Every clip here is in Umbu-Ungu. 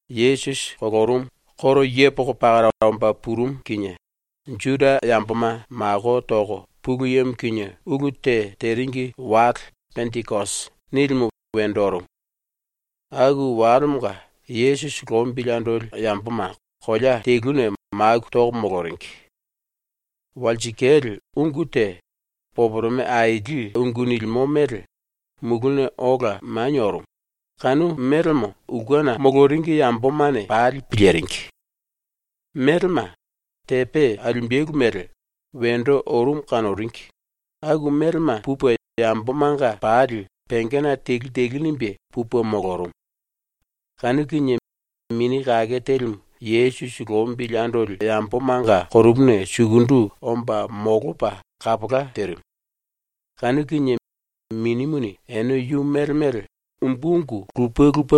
⸤Yesusi kolorumu koro yepoko pakara omba purumu kinie⸥ Juda yamboma mako toko Pulu Yemo kinie ulu te teringi wale ‘Pendikosi’ nilimu wendo orumu. Aku walemonga Yesusi lombili andoli yamboma kolea teluna maku toko moloringi. Walsikale ungu te, poporome aili ungu nilimo mele, muluna ola manie orumu, kanu melemo ulkena moloringi yambomane pali piliringi. Melema, tepe alimbelu mele, wendo orumu kanoringi, aku melema pupe yambomanga pali pengena telu telu nimbe pupe molorumu. Kanu kinie Mini Kake Telimu Yesusi lombili andoli yambomanga konopuna sukundu omba molopa kapola terimu. Kanu kinie Minimuni ene yu mele mele ambolopa ‘Umbu ungu lupe lupe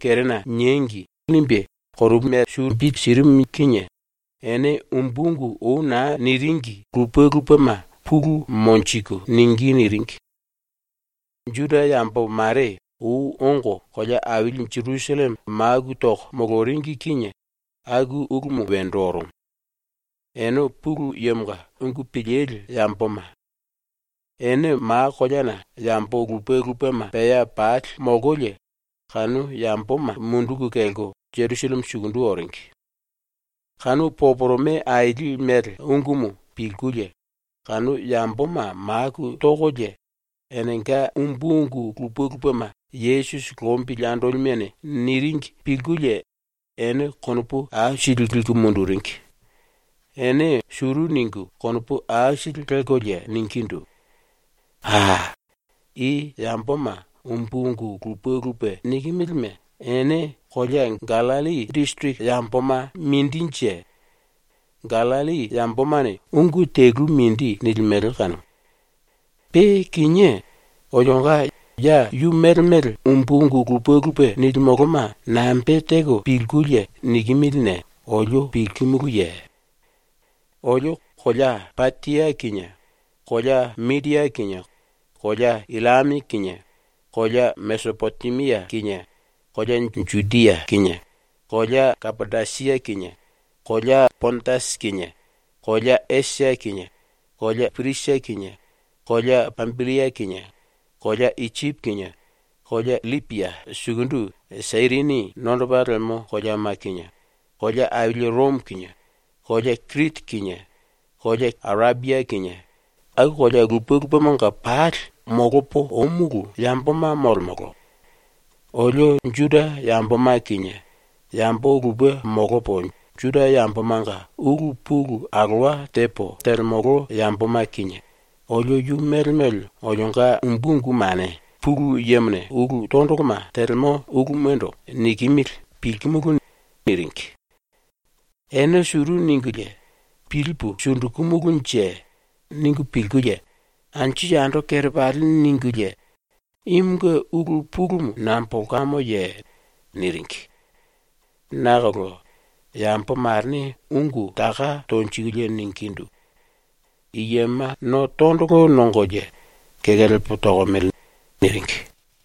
kerena niengi.’ nirimu kinie ene umbu ungu ou naa niringi lupe lupema pulu monjiku ningí niringi. Juda yambo mare ou ongo kolea aili Jerusalleme maku toko moloringi kinie aku ulumu wendo orumu. Ene Pulu Yemonga ungu pilili yamboma. Ene ma koleana yambo lupe lupema pea pali molkolie kanu yamboma munduku kelko Jerusalleme sukundu oringi. Kanu poporome aili mele ungumu pilkulie kanu yamboma maku tokolie enenga umbu ungu lupe lupema Yesusi lombili andolimene niringi pilkulie ene konopu aisili liku munduringi. Ene suru ningu konopu aisili lelkolie ningindu: “A, i yamboma umbu ungu lupe lupe nikimilime ene kolea Gallilli disiriki yamboma mindinje? ⸤Gallilli yambomane ungu telumu mindi nilimele kanumu.⸥ Pe kinié olionga ya yu mele mele umbu ungu lupe lupe nilimoloma nambe teko pilkulie nikimiline olio pilkimuluye? “Olio kolea Patia kinie, kolea Midia kinie, kolea Illame kinie, kolea Mesipotemia kinie, kolea Judia kinie, kolea Kapadosia kinie, kolea Pondasi kinie, kolea Esia kinie, kolea Pirisia kinie, kolea Pambillia kinie, kolea Isipi kinie, kolea LLipia sukundu Sairini nondopa lemo koleama kinie, kolea aili Romo kinie, kolea Kiriti kinie kolea Arepia kinie, aku kolea lupe lupemanga pali molopo ómulu yamboma molemolo. Olio Juda yamboma kinie yambo lupe molopo Juda yambomanga ulu pulu alowa tepo telemolo yamboma kinie, olio yu mele mele olionga umbu ungumane Pulu Yemone ulu tondoloma telemo ulumando nikimili pilkimulu.” niringi. Ene suru ningulie ‘Pilipu sundukumulunje?’ ningu pilkulie, anju yando kerepali ningulie “Imunge ulu pulumu nambolkamoye?” niringi. Nakolo yambo marene ungu taka tonjikulie ningindu: “I yema no tondolo nongolie kekelepa tokomele.” niringi.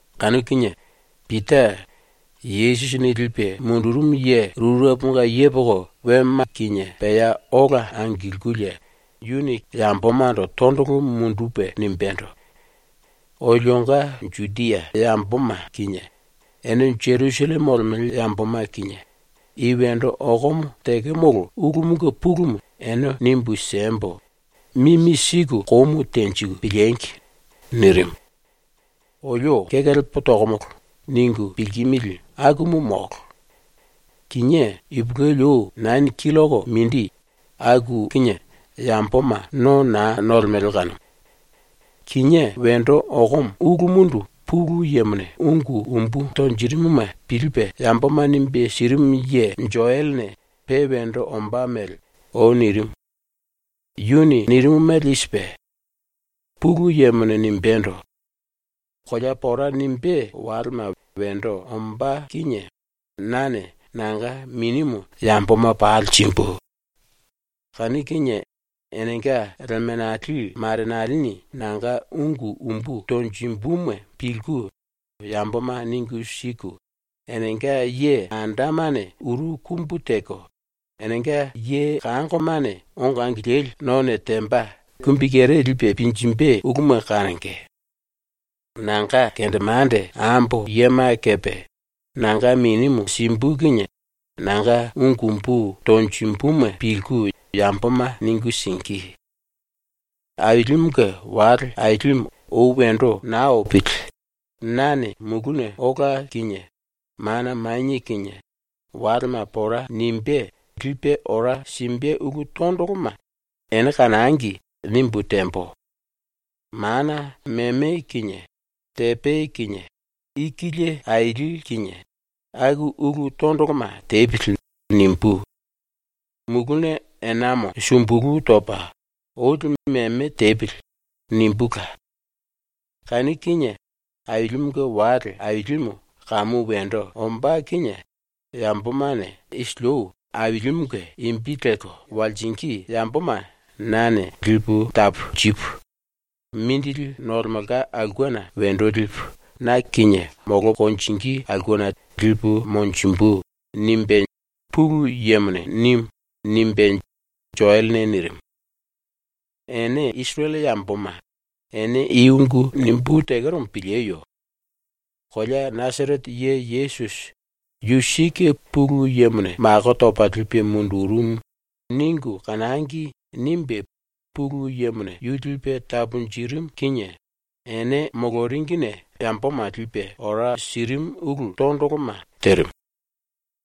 Kanu kinie Pita, ⸤Yesusini lipe mundurumu ye⸥ rureponga yepoko wema kinie pea ola angilkulie yambomando tondolo mundupe nimbendo: “Olionga Judia yamboma kinie, ene Jerusalleme molemele yamboma kinie, i wendo okomo tekemolo ulumunge pulumu ene nimbu siembo, mimi siku komu tenjiku piliengi!” nirimu. “‘Olio kekelepa tokomolo.’ ningu pilkimili akumu molo. Kinié ipulueli ou nani killoko mindi, aku kinie yamboma no naa nolemele kanumu. Kinié wendo okomo ulumundu Pulu Yemone ungu umbu tonjirimuma pilipe yamboma nimbe sirimu ye Joelene pe wendo ombá mele ou nirimu. Yuni nirimu mele i sipe: “Pulu Yemone nimbendo: “Kolea pora nimbé walema wendo ombá kinie nane nanga Minimu yamboma pali simbu. Kanu kinie enenga lemenali marenalini nanga ungu umbu tonjimbuma pilku yamboma ningu siku, enenga ye andamane uru kumbu teko, enenga ye kangoma ongo angilili none temba kumbikere lipe pinjimbe uluma kanonge. Nanga kendemande ambo yema kepe nanga Minimu simbu kinie nanga ungu umbu tonjimbuma pilku yamboma ningu singí. Ailimunge wale ailimu ou wendo naa opili nane muluna ola kinie mana manie kinie ⸤walema pora nimbé⸥ lipe ora simbe ulu tondoloma ‘Ene kanangi.’ nimbu tembo. ‘Mana meme kinie tepe kinie ikilie aili kinie, aku ulu tondoloma tepili.’ nimbú. ‘Muluna enamo sumbulu topa olimu meme tepili.’ nimbula. Kanu kinie Ailimunge wale ailimu kamu wendo ombá kinie yambomane isili ou Ailimunge imbi lelko walsingí yamboma nane lipu taponjipu mindili nolemelka aulkena wendo lipu na kinie molko konjingí aulkena lipu monjimbu.” nimbe Pulu Yemone nimu.” nimbe Joelene nirimu. “Ene Isirele Yamboma, ene i ungu nimbú tekeromo pilieyo. ‘Kolea Nasarete ye Yesusi ‘Yu sike Pulu Yemone mako topa lipe mundurumu.’ ningu kanangi.’ nimbe Pulu Yemone yu lipe taponjirimu kinie ene moloringine yamboma lipe ora sirimu ulu tondoloma terimu.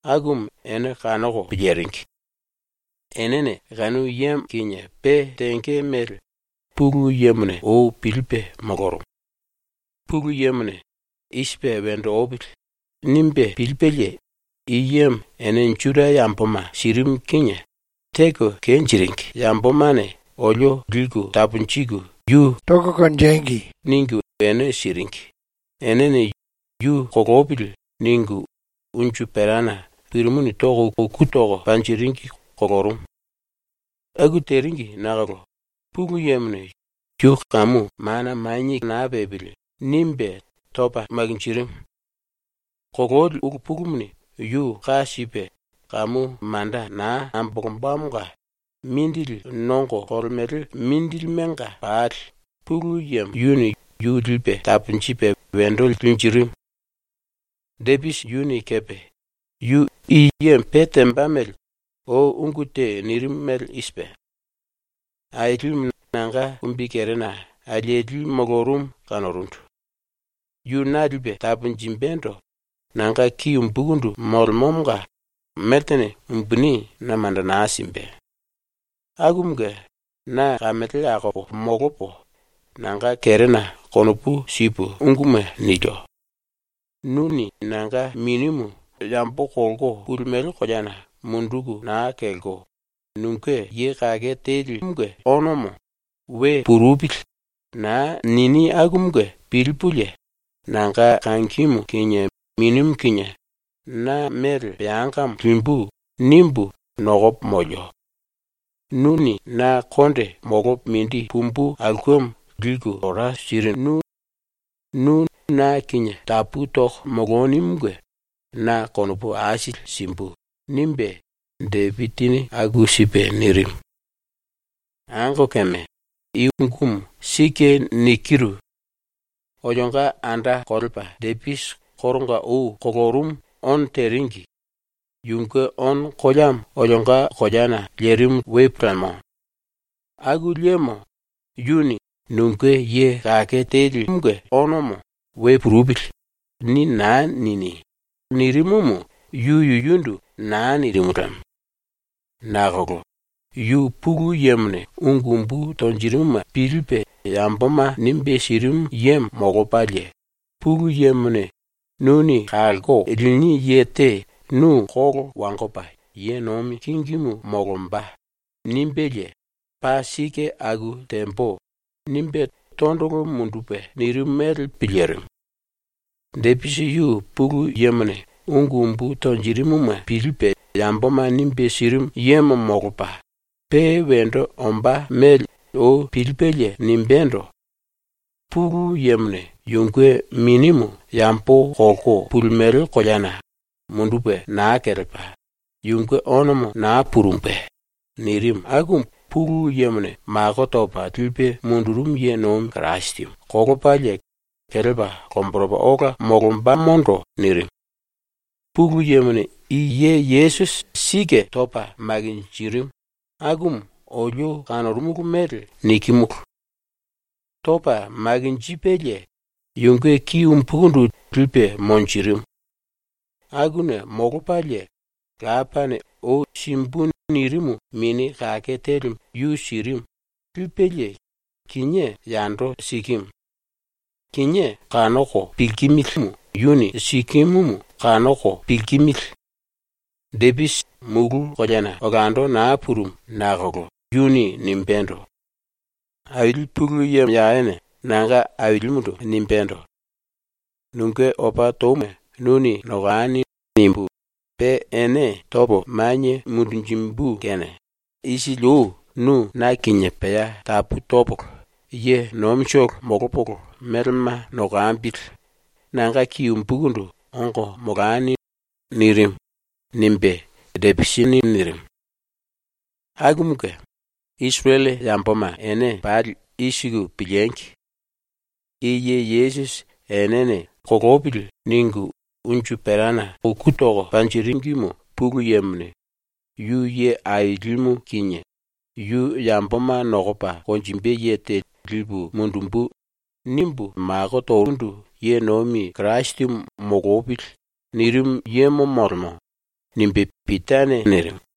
Akumu ene kanoko piliringi. Enene kanu yemo kinie pe tenge mele Pulu Yemone ou pilipe molorumu. Pulu Yemone ‘I sipe wendo opili.’ nimbe pilipelie i yemo ene Juda Yamboma sirimu kinie ‘Teko kenjiringi yambomane olio liku taponjiku yu tangi.’ ningu ene siringi, enene ‘Yu kolopili.’ ningu unju perana pirimuni toko uku toko panjiringi kolorumu. ⸤Aku teringi⸥ nakolo Pulu Yemone ‘Yu kamu mana naa pepili.’ nimbe topa makinjirimu. Kololi ulu pulumuni yu ka sipe kamu manda naa ambolombamonga mindili nongo kolemele mindilimenga pali Pulu Yemo yuni yu lipe taponjipe wendo linjirimu. “Depisi yuni kepe yu i yemo pe temba mele ou ungu te nirimu mele i sipe: “Ailimu nanga kumbikerena alieli molorumu kanorundu. Yu na lipe taponjimbendo nanga ki umbukundu molemomonga meltene umbuni na manda naa simbe. Akumunge na kamele akopo molopo, nanga kerena konopu sipu unguma nilio. Nuni nanga minimu yambo kolko pulimele koleana munduku naa kelko, nunge Ye Kake Teli onomo ‘We purupili.’ naa nini akumunge pilipulie, ‘Nanga kangimu kinie minimu kinie na mele peangamo limbu.’ nimbu nokopo molio. Nuni na konde molopo mindi pumbu aulkemo liku ora sirinu, nu na kinie tapu toko molonimunge na konopu aisili simbu.” nimbe Depisini aku sipe nirimu. “Angokeme, i ungumu sike nikiru. Olionga anda kolepa Depisi koronga ou kolorumu ono teringi, yunge ono koleamo olionga koleana lerimu lemo. Aku liemo yuni ‘Nunge Ye Kake Teli onomo ‘We purupili.’ ni naa nini.’ nirimumu yu yuyundu naa nirimu lemo. Nakolo yu Pulu Yemone ungu umbu tonjirimuma pilipe yamboma nimbe sirimu yemo molopalie, Pulu Yemone “Nuni kalko lini ye te nu kolo wangopa ye nomi kingimu molomba.” nimbelie “Paa sike aku tembo.” nimbe tondolo mundupe nirimu mele pilirimu. Depisi ⸤yu Pulu Yemone ungu umbu tonjirimuma pilipe yamboma nimbe sirimu yemo molopa⸥ pe wendo ombá mele ou pilipelie nimbendo: ‘Pulu Yemone yunge minimu yambo kolko pulimele koleana mundupe naa kelepa, yunge onomo naa purumbe.’ nirimu akumu Pulu Yemone mako topa lipe mundurumu ye nomi Kirasimu kolopalie kelepa lomboropa ola molombamondo nirimu. Pulu Yemone i ye Yesusi sike topa makinjirimu, akumu olio kanorumulu mele nikimulu. “Topa makinjipelie yunge ki umbukundu lipe monjirimu. Akuna molopalie Lapane ou “Simbu.” nirimu Mini Kake Telimu yu sirimu, lipelie, kinié yando sikimu. Kinié kanoko pilkimilimu yuni sikimumu kanoko pilkimili. Depisi mulu koleana olando naa purumu nakolo yuni nimbendo: “Aili ⸤Pulu Yemo Yawene⸥ nanga Ailimundu nimbendo: “‘Nunge opa touma nuni nokani.’ nimbu, pe ene topo manie mundunjimbu kene isili ou nu ⸤na kinie pea tapu topolo ye nomitolo molopolo melema nokambili⸥ nanga ki umbukundu ongo molani.” nirimu.” nimbe Depisini nirimu. “Akumunge Isirele yamboma ene pali i siku piliengi: I ye Yesusi enene unju perana toko uku toringimu Pulu Yemone “Yu Ye Ailimu kinie, yu ‘Yamboma nokopa konjimbe ye te lipu mundumbu.’ nimbu mako torundu ye nomi Kirasimu molopili.” nirimu yemo molemo.” nimbe Pitane nirimu.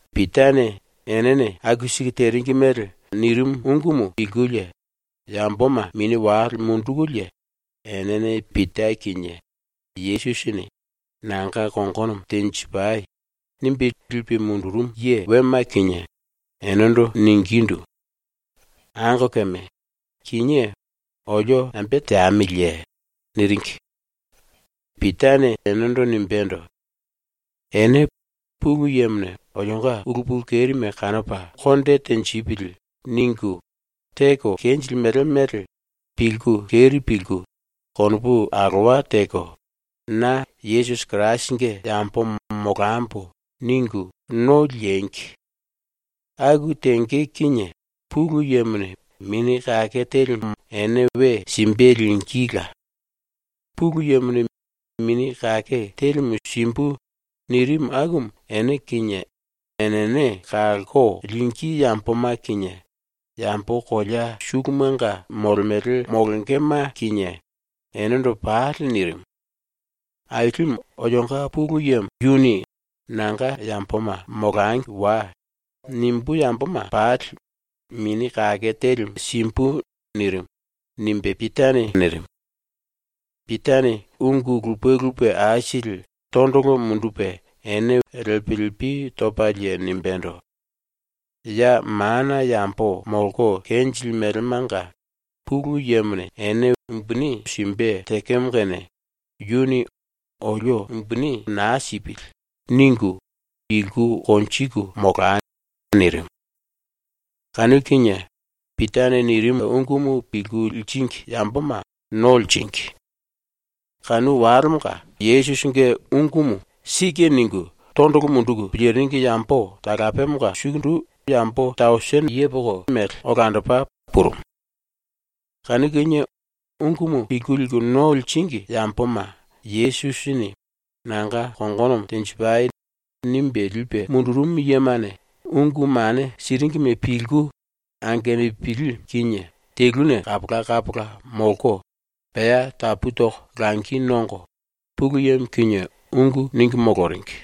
Pitane enene aku siku teringi mele nirimu ungumu pilkulie yamboma mini wale mundukulie enene Pita kinie Yesusini “Nanga kongonomo tenjipai.” nimbe lipe mundurumu ye wema kinie enendo ningindu: “Angokeme, kinié olio nambe teamiliye?” niringi. Pitane enendo nimbendo: “Ene ‘Pulu Yemone olionga ulu pulu kerime kanopa konde tenjipili.’ ningu teko kenjilimele mele pilku keri pilku, konopu alowa teko, ‘Na Yesusi Kirasinge yambomo molambo.’ ningu no liengi. Aku tenge kinie Pulu Yemone Mini Kake Telimu ene we simbe lingíla. Pulu Yemone ‘Mini Kake Telimu simbu.’ nirimu akumu ene kinie enene kalko lingí yamboma kinie yambo kolea sulumanga molemele molongema kinie enendo pali nirimu. Ailimu olionga Pulu Yemo yuni ‘ ‘Nanga yamboma molangi wai.’ nimbú yamboma pali Mini Kake Telimu simbu.’ nirimu.” nimbe Pitane nirimu. Pitane ungu lupe lupe aisili tondolo mundupe ene lepi lepi topalie nimbendo: “Ya mana yambo molko kenjilimelemenga Pulu Yemone ene mongo simbe tekemo kene yuni ‘Olio mongo naa sipili.’ ningu, pilku konjiku molai.” nirimu. Kanu kinie Pitane nirimu ungumu pilku liringi yamboma no liringi. Kanu walemonga Yesusinge ungumu ‘Sike.’ ningu tondolo munduku piliringi yambo talapemonga sukundu yambo tere tausini mele olandopa purumu. Kanu kinie ungumu pilku liku no liringi yamboma Yesusini “Nanga kongonomo tenjipai.” nimbe lipe mundurumu yemane ungu mane siringime pilku, angenupili kinie teluna kapola kapola molko, pea tapu toko langi nongo, Pulu Yemo kinie ungu ningu moloringi.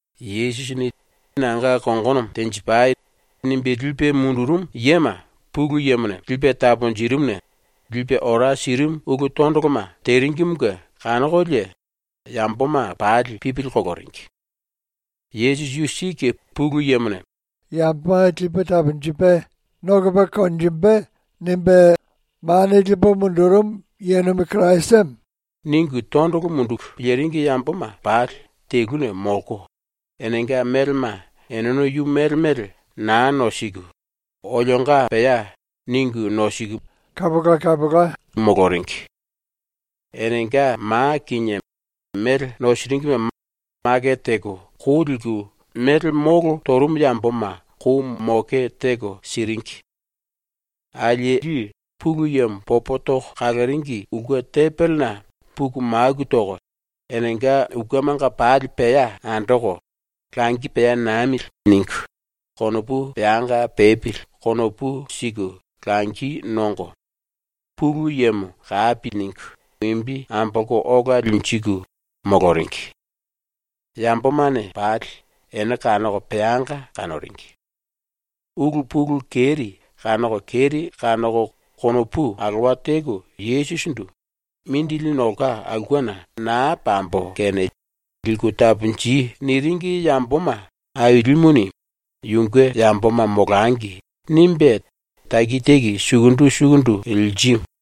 Yesusini “Nanga kongonomo tenjipai.” nimbe lipe mundurumu yema Pulu Yemone lipe taponjirimuna lipe ora sirimu ulu tondoloma teringimunge kanokolie yamboma pali pipili koloringi. ‘Yesusi yu sike ⸤Pulu Yemone “Lipu mundumbu.” nimbe mako torumu ye nomi Kirasimu.’⸥ ningu tondolo munduku piliringi yamboma pali teluna molko, enenga melema eneno yu mele mele naa nosiku, ‘Olionga pea’ ningu nosiku moloringi. Enenga ma kinie mele nosiringime makete teko kou liku mele molo torumu yamboma kou moke teko siringi. Alieli ⸤Pulu Yemo popo toko kaloringi⸥ ulke tembelena puku maku toko, enenga ulkemanga pali pea andoko ‘Langi pea namili.’ ningu, konopu peanga pepili konopu siku langi nongo, Pulu Yemo kapi ningu imbi ambolko ola linjiku, moloringi. Yambomane pali ene kanoko peanga kanoringi. Ulu pulu keri kanoko keri kanoko konopu alowa teko Yesusindu “Mindili nolka aulkena naa pambo kene liku taponji.” niringi yamboma Ailimuni ‘Yunge yamboma molangi.’ nimbe taki taki sukundu sukundu lirimu.